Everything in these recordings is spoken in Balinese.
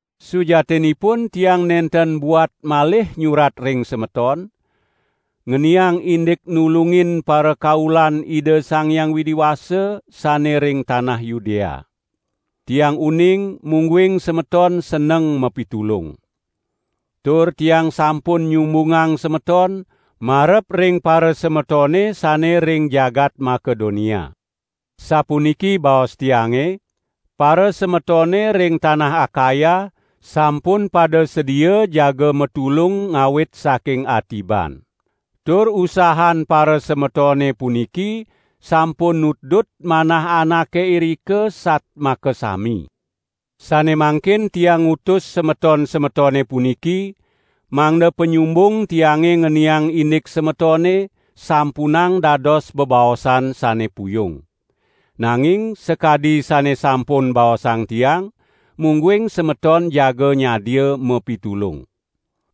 Sujatinipun tiang nenten buat malih nyurat ring semeton, ngeniang indik nulungin parakaulan Ida Sang Hyang Widi Wasa sane ring tanah Yudea. Tiang uning mungguing semeton seneng mapitulung. Tur tiang sampun nyumbungang semeton marep ring parasemetone sane ring jagat Makedonia. Sapuniki baos tiange: "Parasemetone ring tanah Akaya sampun pada sedia jaga matulung ngawit saking atiban." Tur usahan parasemetone puniki sampun nutdut manah anake irika sat makasami. Sane mangkin tiang ngutus semeton-semetone puniki, mangda panyumbung tiange ngeniang indik semetone, sampunang dados bebaosan sane puyung. Nanging sakadi sane sampun baosang tiang, mungguing semeton jaga nyadia mapitulung.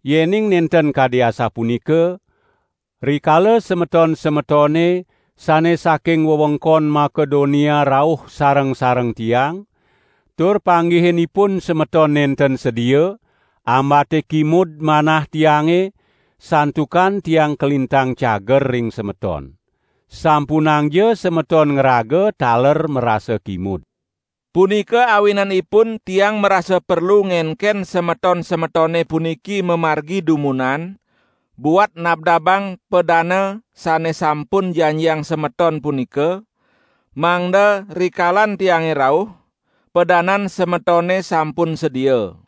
Yening nenten kadi asapunika, rikala semeton-semetone sane saking wewengkon Makedonia rauh sareng-sareng tiang, tur panggihin ipun semeton nenten sedia, ambate kimud manah tiange (santukan tiang kalintang cager ring semeton. Sampunangja semeton ngraga taler marasa kimud). Punika awinanipun tiang marasa perlu ngenken semeton-semetone puniki mamargi dumunan, buat nabdabang padana sane sampun janjiang semeton punika, mangda rikalan tiange rauh, padanan semetone sampun sedia.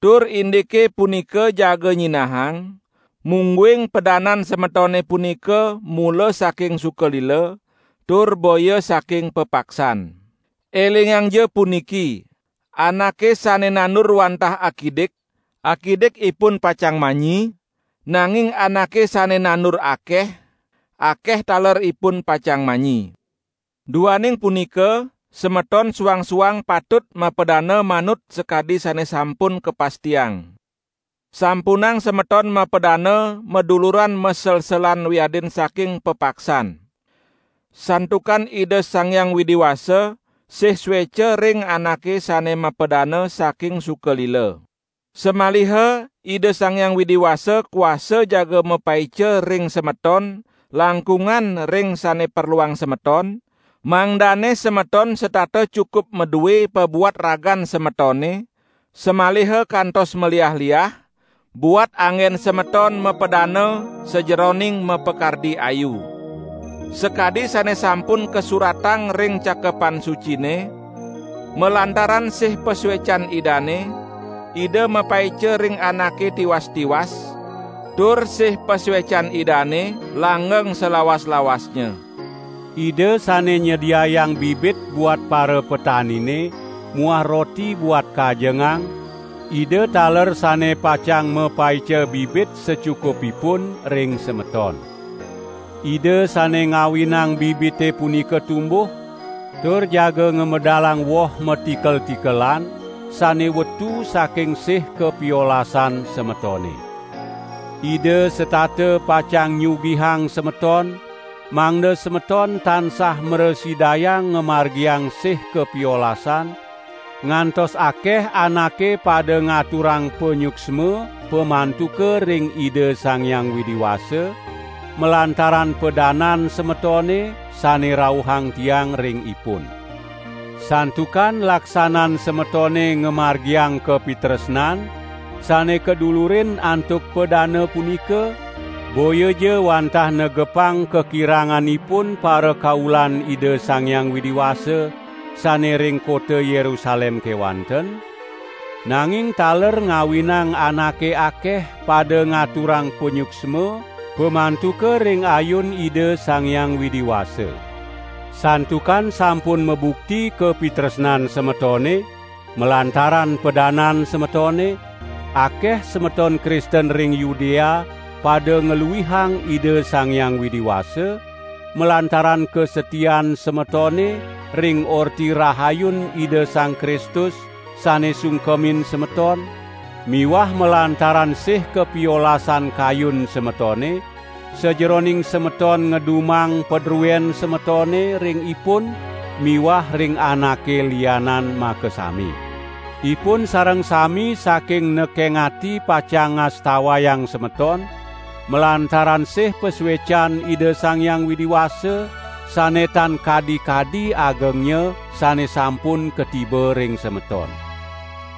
Tur indike punika jaga nyinahang, mungguing padanan semetone punika mula saking suka lila, tur boya saking pepaksan. Elingangja puniki: Anake sane nandur wantah akidik, akidik ipun pacang manyi, nanging anake sane nandur akeh, akeh taler ipun pacang manyi. Duaning punika semeton suang-suang patut mapadana manut sakadi sane sampun kapastiang. Sampunang semeton mapadana maduluran maselselan wiadin saking pepaksan. Santukan Ida Sang Hyang Widi Wasa sih sueca ring anake sane mapadana saking suka lila. Samaliha Ida Sang Hyang Widi Wasa kuasa jaga mapaica ring semeton langkungan ring sane perluang semeton, mangdane semeton setata cukup madue pabuat ragan semetone, samaliha kantos maliah-liah, buat anggen semeton mapadana sajeroning mapakardi ayu. Sakadi sane sampun kasuratang ring Cakepan Sucine: "Malantaran sih pasuecan Idane, Ida mapaica ring anake tiwas-tiwas, tur sih pasuecan Idane langgeng salawas-lawasnya." Ida sane nyediayang bibit buat parapetanine muah roti buat kajengang, Ida taler sane pacang mapaica bibit sacukupipun ring semeton. Ida sane ngawinang bibite punika tumbuh, tur jaga ngamedalang woh matikel-matikelan sane wetu saking sih kapiolasan semetone. Ida setata pacang nyugihang semeton mangda semeton tansah mrasidayang ngamargiang sih kapiolasan, ngantos akeh anake pada ngaturang panyuksma pamantuka ring Ida Sang Hyang Widi Wasa, malantaran padanan semetone sane rauhang tiang ring ipun. Santukan laksanan semetone ngamargiang kapitresnan sane kadulurin antuk padana punika, boyaja wantah negepang kakiranganipun parakaulan Ida Sang Hyang Widi Wasa sane ring kota Yerusalem kewanten, nanging taler ngawinang anake akeh pada ngaturang panyuksma pamantuka ring ayun Ida Sang Hyang Widi Wasa. Santukan sampun mabukti kapitresnan semetone, malantaran padanan semetone, akeh semeton Kristen ring Yudea pada ngluihang Ida Sang Hyang Widi Wasa, malantaran kasatian semetone ring Orti Rahayun Ida Sang Kristus sane sungkemin semeton miwah malantaran sih kapiolasan kayun semetone, sajeroning semeton ngedumang padruen semetone ring ipun miwah ring anake lianan makasami. Ipun sareng sami saking nekeng ati pacang ngastawayang semeton, malantaran sih pasuecan Ida Sang Hyang Widi Wasa, sane tan kadi-kadi agengnya sane sampun katiba ring semeton.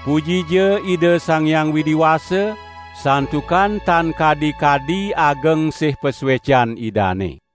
Pujija Ida Sang Hyang Widi Wasa santukan tan kadi-kadi ageng sih pasuecan Idane.